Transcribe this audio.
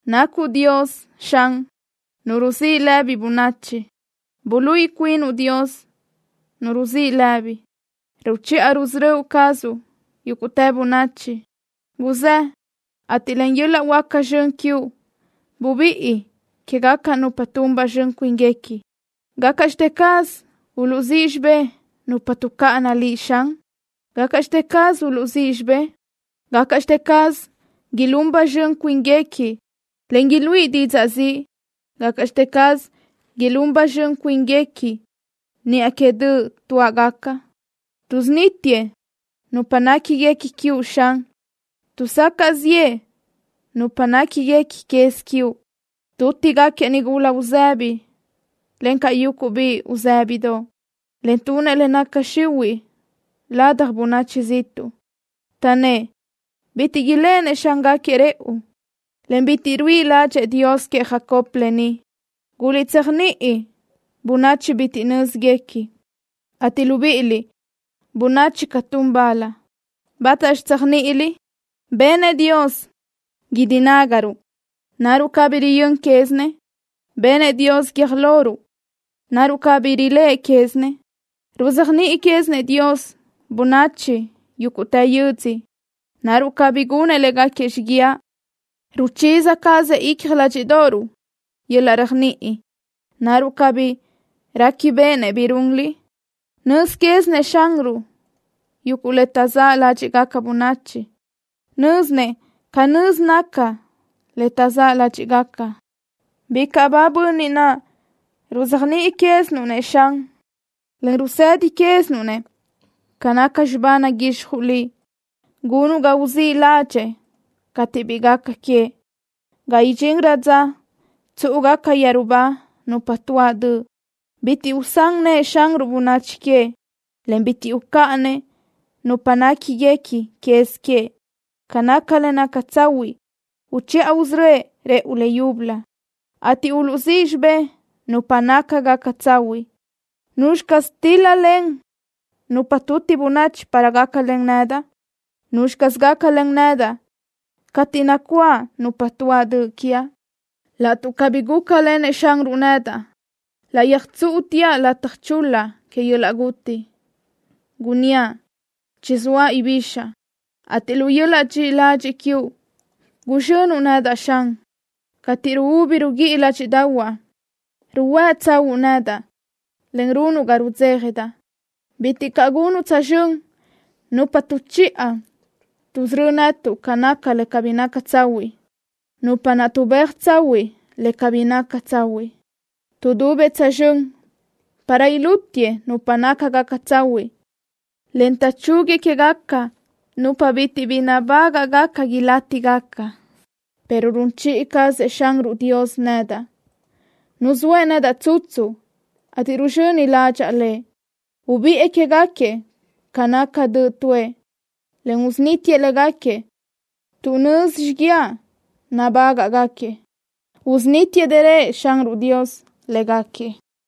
Nacuʼ Dios, Xan, Nu ruzíʼ lëbi bönachi. Buluíʼi cuinuʼ, Dios, Nu ruzíʼ lëbi. Ruchiʼa rusörö́ cazuʼ yúguʼtë bönachi. Guzë́, ateʼ len yöl-laʼ huáca zxön quiuʼ bubíʼi quégaca nupa tun ba zxön cuínguequi. ¿Gácaʼxte caz uluʼzíʼ xibé nupa tuʼcáʼana Liʼ, Xan? ¿Gácaʼxte caz uluʼzíʼ xibé? ¿Gácaʼxte caz ilún ba zxön cuínguequi, en iluíʼi didzaʼ ziʼ? ¿Gácaʼxte caz ilún ba zxön cuínguequi niʼa que döʼ tuáʼgaca? Tuʼsunítiëʼ nupa néquiguequi quiuʼ, Xan. Tuʼsacaʼ ziʼë nupa néquiguequi quez quiuʼ. Tútigaquiëʼ nigula uzëbi, encaʼ yuguʼ biʼi uzë́bidoʼ, en tunëʼ le naca xihuiʼ ladaj bönachi ziʼtuʼ. Taʼnnë́ʼ: “Bitiʼ iléʼenëʼ Xángaquiëʼ rëʼu, en bitiʼ ruíʼi ládxëʼë Dios queëʼ Jacob lë ni.” Guliʼtséajniʼi, bönachi bitiʼ nö́zguequi, ateʼ libíʼiliʼ, bönachi catún bal, ¿bátaxi tséajniʼiliʼ? Benëʼ Dios guídi nágaruʼ. ¿Naruʼ cabí riyö́n quézinëʼ? Benëʼ Dios guiö́j loruʼ. ¿Naruʼ cabí riléʼe quézinëʼ? Ruzéajniʼi quézinëʼ Dios bönachi yúguʼtë yödzö. ¿Naruʼ cabí gunëʼ léguequi xiguiaʼ? Ruchiza cazëʼ icja ládxiʼdoʼoruʼ yöl-laʼ réajniʼi. ¿Naruʼ cabí réquibeʼenëʼ bi runliʼ? Nöz quézinëʼ Xanruʼ yuguʼ le taʼzáʼ ládxiʼgaca bönachi. Nö́zinëʼ canö́z naca le taʼzáʼ ládxiʼgaca. Bicaʼ ba bönniʼ naʼ ruzéajniʼi quézinuʼ-nëʼ, Xan, en rusedi quézinuʼ-nëʼ ca naca xibá naguixjuʼ Liʼ. Gunuʼ ga uzíʼ ládxëʼë cateʼ bi gaca queëʼ, ga idxinrö dza tsúʼugaca yeru ba nupa tuáʼ döʼ. Bitiʼ usán nëʼë Xanruʼ bönachi queëʼ, en bitiʼ ucáʼanëʼ nupa néquiguequi quez queëʼ. Ca naca le naca tsahuiʼ uchiʼa usörö́ëʼ rëʼu le yúbölö, ateʼ uluʼzíʼ xibé nupa nácagaca tsahuiʼ. ¿Nuzxi caz tíl-lalen nupa tuti bönachi para gácalen nedaʼ? ¿Nuzxi caz gácalen nedaʼ cateʼ nacuáʼ nupa tuáʼ döʼ quiaʼ? Laʼtuʼ cabí gúcalenëʼ Xanruʼ nedaʼ, laʼ yöjtsúʼuteaʼ lataj chul-la que yöl-laʼ guti. Gunníaʼ: “Chizóaʼ ibixaʼ”, ateʼ lu yöl-laʼ dxiʼi ladxiʼ quiuʼ guzxönuʼ nedaʼ, Xan. Cateʼ ruúbi ruguíʼi ládxiʼdaʼahuaʼ, ruhuë́ tsahúʼu nedaʼ, en runuʼ ga rudzéjadaʼ. Bitiʼ caʼ gunuʼ tsözxö́n nupa tuʼchiʼa tuʼsörö́ netuʼ ca naca le cabí naca tsahuiʼ, nupa naʼ tuʼbéaj tsahuiʼ le cabí naca tsahuiʼ. Tuʼdubëʼ tsözxö́n para ilútiëʼ nupa nácagaca tsahuiʼ, en taʼchúguiëʼ quégaca nupa bitiʼ bi nabágaʼgaca ilátigaca, pero run chiʼi cazëʼ Xanruʼ Dios nedaʼ. Nuzóëʼ nedaʼ tsutsu, ateʼ ruzxöni ládxaʼa lëʼ. Ubiʼë quégaquiëʼ ca naca döʼ tuʼë, en usunítiëʼ légaquiëʼ tuʼ nözi xiguiaʼ nabágaʼgaquiëʼ. Usunítiëʼ dërö Xanruʼ Dios légaquiëʼ.